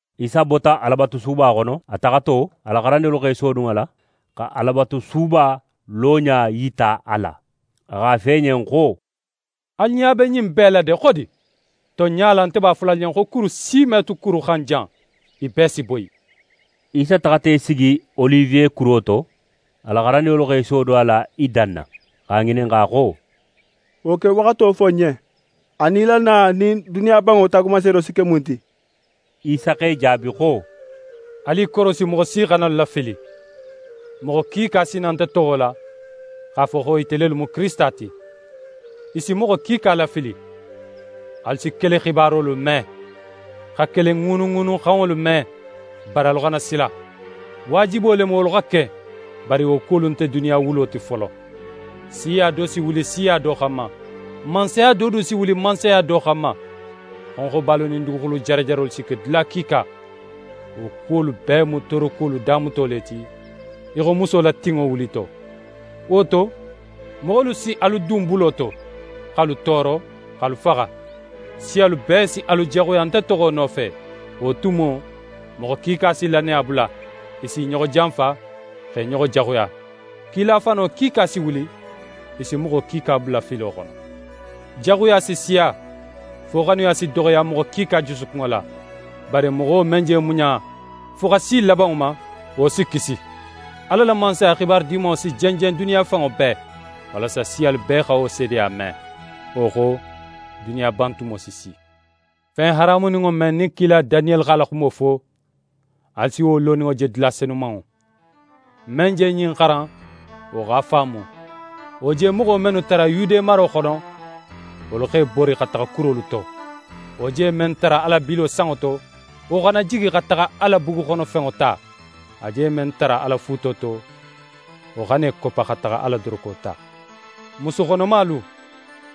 Isa bota Alabatusuba xono. A taxato, a la xarandinŋolu x'e sodun a la xa Alabatusuba loɲa yita a la. A x'a fo i ɲen xo: «Alu ɲa be ɲin bee la de, xodi? Tonɲa la, nte b'a fola alu ɲen xo kuru si me tu kuru xan jan, i bee si boyi.» Isa taxata í sigi Oliwe kuro to. A la xarandinŋolu x'e sodun a la i danna, x'a ŋininxa xo: «Wo kewaxato fo n ɲen, anin í la na nin duniya banŋo taagumanseedo si ke mun ti.» Isa x'e jaabi xo: «Alu i korosi, moxo si xana alu lafili. Moxo kiika si na nte toxo la, x'a fo xo ite lelu mu Kirisita ti. I si moxo kiika lafili. Alu si kele xibarolu me, xa kele ŋuunuŋuunuxanŋolu me. Bari, alu xana sila. Waajibo le mu wolu xa ke bari wo kuwolu nte duniya wulo ti folo. Siya do si wuli siya do xanma, mansaya do du si wuli mansaya do xanma. Xonxobalu nin duguxulu jarajarolu si ke dula kiika. Wo kuwolu bee mu toorokuwolu damuto le ti, í xo muso la tinŋo wulito. «Wo to, moxolu si alu dun bulo to, x'alu tooro, x'alu faxa. Siyalu bee si alu jaxuya nte toxo nofe. Wo tumo, moxo kiika si lannaya bula, i si i ɲoxo janfa, x'e ɲoxo jaxuya. Kila fano kiika si wuli, i si moxo kiika bula filo xono. Jaxuya si siya, fo xanuya si doxoya moxo kiika jusukunŋo la. Bari moxo men je muɲa fo xa si labanŋo ma, wo si kisi. Ala la Mansaya xibaru Dimanŋo si jenjen duniya fanŋo bee, walasa siyalu bee xa wo seedeya me. Wo xo, duniya bantumo si si.» «Fen haramuninŋo men, nin kila Daniyeli x'a la xumo fo, alu si wo loninŋo je dula Senumanŋo. Men je ɲin xaran, wo x'a faamu! Wo je moxo mennu tara Yude maro xono, wolu x'e bori xa taxa kurolu to. Wo je men tara a la bilo sanŋo to, wo xana jigi xa taxa a la buguxono fenŋo ta. A je men tara a la fuuto to, wo xana í koppa xa taxa a la doroko ta. Musu xonomalu,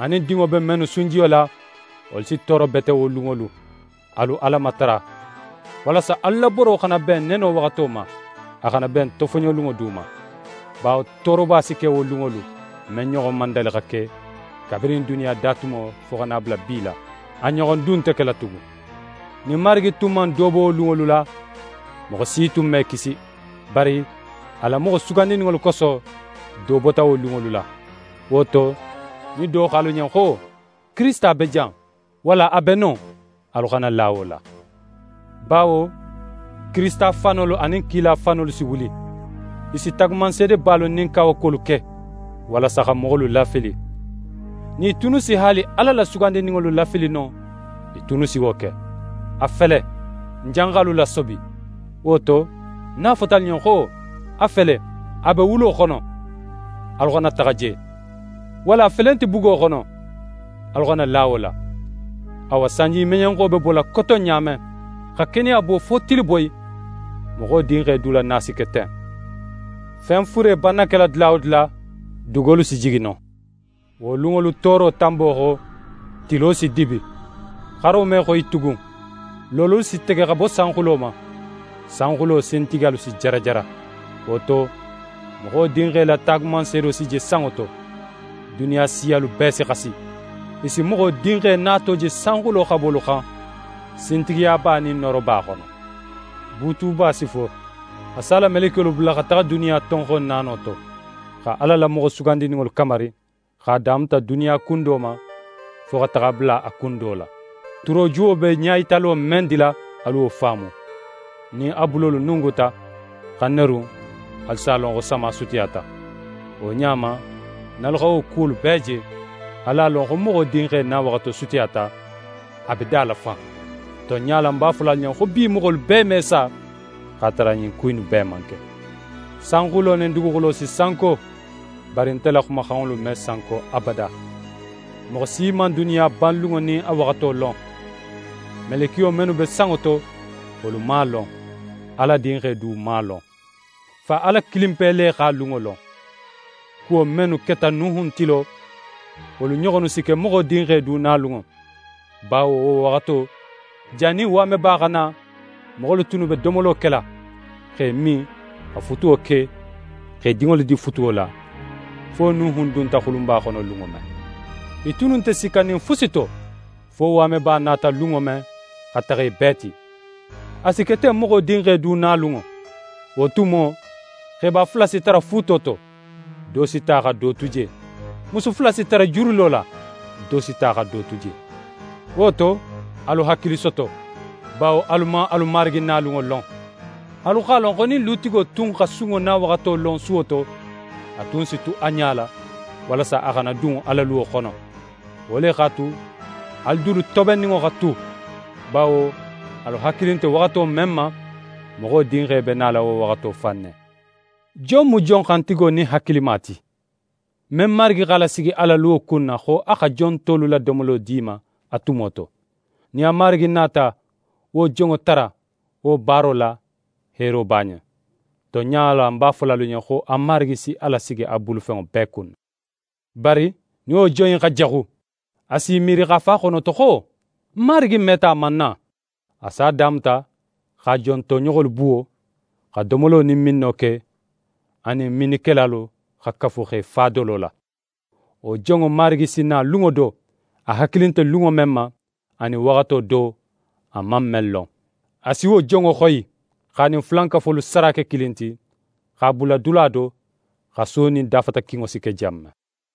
anin dinŋo be mennu sunjiyo la, wolu si tooro bete wo lunŋolu. Alu Ala matara, walasa alu la boro xana ben neno waxato ma, a xana ben tofoɲolunŋo du ma. Bawo tooroba si ke wo lunŋolu, men ɲoxon man dali xa ke, kabirin duniya datumo, fo xa na a bula bi la. A ɲoxon du nte kela tugun. Nin Marigi tun man do bo wo lunŋolu la, moxo si tun me kisi. Bari a la moxo sugandininŋolu koso, do bota wo lunŋolu la. Wo to, nin do xo alu ɲen xo: “Kirisita be jan!” walla: “A be non,” alu xana la wo la. Bawo kirisita fanolu anin kila fanolu si wuli. I si taagumanseedebalu nin kawakuwolu ke, walasa xa moxolu lafili. Nin i tunnu si haali Ala la sugandininŋolu lafili no, i tunnu si wo ke. A fele, ń janxa alu lasobi. «Wo to, nin a fota alu ɲen xo: “A fele, a be wulo xono,” alu xana taxa je. Walla: “A felenti bugo xono,” alu xana la wo la. Awa, sanjimeɲenxo be bola koton ɲa men, xa keneya bo fo tiliboyi, Moxo Dinxe du la na si ke ten. Fen fure banna kela dula wo dula, dugolu si jigi non.» «Wo lunŋolu tooro tanbo xo, tilo si dibi, xaro me xoyi tugun, loololu si tege xa bo sanxulo ma, sanxulo sintigiyalu si jarajara. Wo to, Moxo Dinxe la taagumanseedo si je sanŋo to. Duniya siyalu bee si xasi. I si Moxo Dinxe nato je sanxulo xabolu xan, sintigiyaba nin nooroba xono. Buutuba si fo. A si a la melekiyolu bula xa taxa duniya tonxon naano to, xa Ala la moxo sugandininŋolu kamari, x'a damuta duniya kun do ma, fo xa taxa a bula a kun do la.» «Turojuwo be ɲayitalo men dila, alu wo faamu: Nin a bulolu nunguta, xa nerun, alu si a lon xo sama sutiyata. Wo ɲa ma, nin alu xa wo kuwolu bee je, alu a lon xo Moxo Dinxe nawaxato sutiyata, a be da la fan. Tonɲa la, ń b'a fola alu ɲen xo bi moxolu bee me sa, x'a tara ɲin ku innu bee man ke. Sanxulo nin duguxulo si sanko, bari nte la xumaxanŋolu me sanko abada.» «Moxo si man duniya banlunŋo nin a waxato lon. Melekiyo mennu be sanŋo to, wolu man a lon, Ala Dinxe du man a lon. Fa Ala kilinpe le x'a lunŋo lon. Kuwo mennu keta Nuhun tilo, wolu ɲoxonnu si ke Moxo Dinxe du nalunŋo. Bawo wo waxato, jannin waameba xa na, moxolu tunnu be domolo kela, x'e min, xa futuwo ke, x'e dinŋolu di futuwo la, fo Nuhun dunta xulunba xono lunŋo men. I tunnu nte sikkanin fusi to, fo waameba nata lunŋo men, xa taxa i bee ti. A si ke ten Moxo Dinxe du nalunŋo. Wo tumo, xeba fula si tara fuuto to, do si ta xa do tu je. Musu fula si tara jurilo la, do si ta xa do tu je. Wo to, alu hakili soto, bawo alu man alu Marigi nalunŋo lon. Alu x'a lon xo nin lutigo tun xa sunŋo nawaxato lon suwo to, a tun si tu a ɲala, walasa a xana dun a la luwo xono. Wo le x'a tu, alu dulu tobenninŋo xa tu, bawo alu hakili nte waxato men ma, Moxo Dinxe be nala wo waxato fan ne.» «Jon mu jon xantigo nin hakilima ti, men marigi x'a lasigi a la luwo kunna, xo a xa jon tolu la domolo di i ma a tumo to? Nin a marigi nata wo jonŋo tara wo baaro la, heero b'a ɲen. Tonɲa la, ń b'a fola alu ɲen xo a marigi si a lasigi a bulufenŋo bee kunna. Bari nin wo jon in xa jaxu, a si í miiri x'a fo a xonoto xo: “Ń marigi meta a man na.” A si a damuta x'a jon toɲoxolu buwo, xa domolo nin minno ke, a nin minnikelalu xa kafu x'e fa dolo la. Wo jonŋo marigi si na lunŋo do, a hakili nte lunŋo men ma, anin waxato do, a man men lon. A si wo jonŋo xoyi, x'a nin fulankafolu sara ke kilin ti, x'a bula dula do, xaso nin dafatakinŋo si ke jan men.»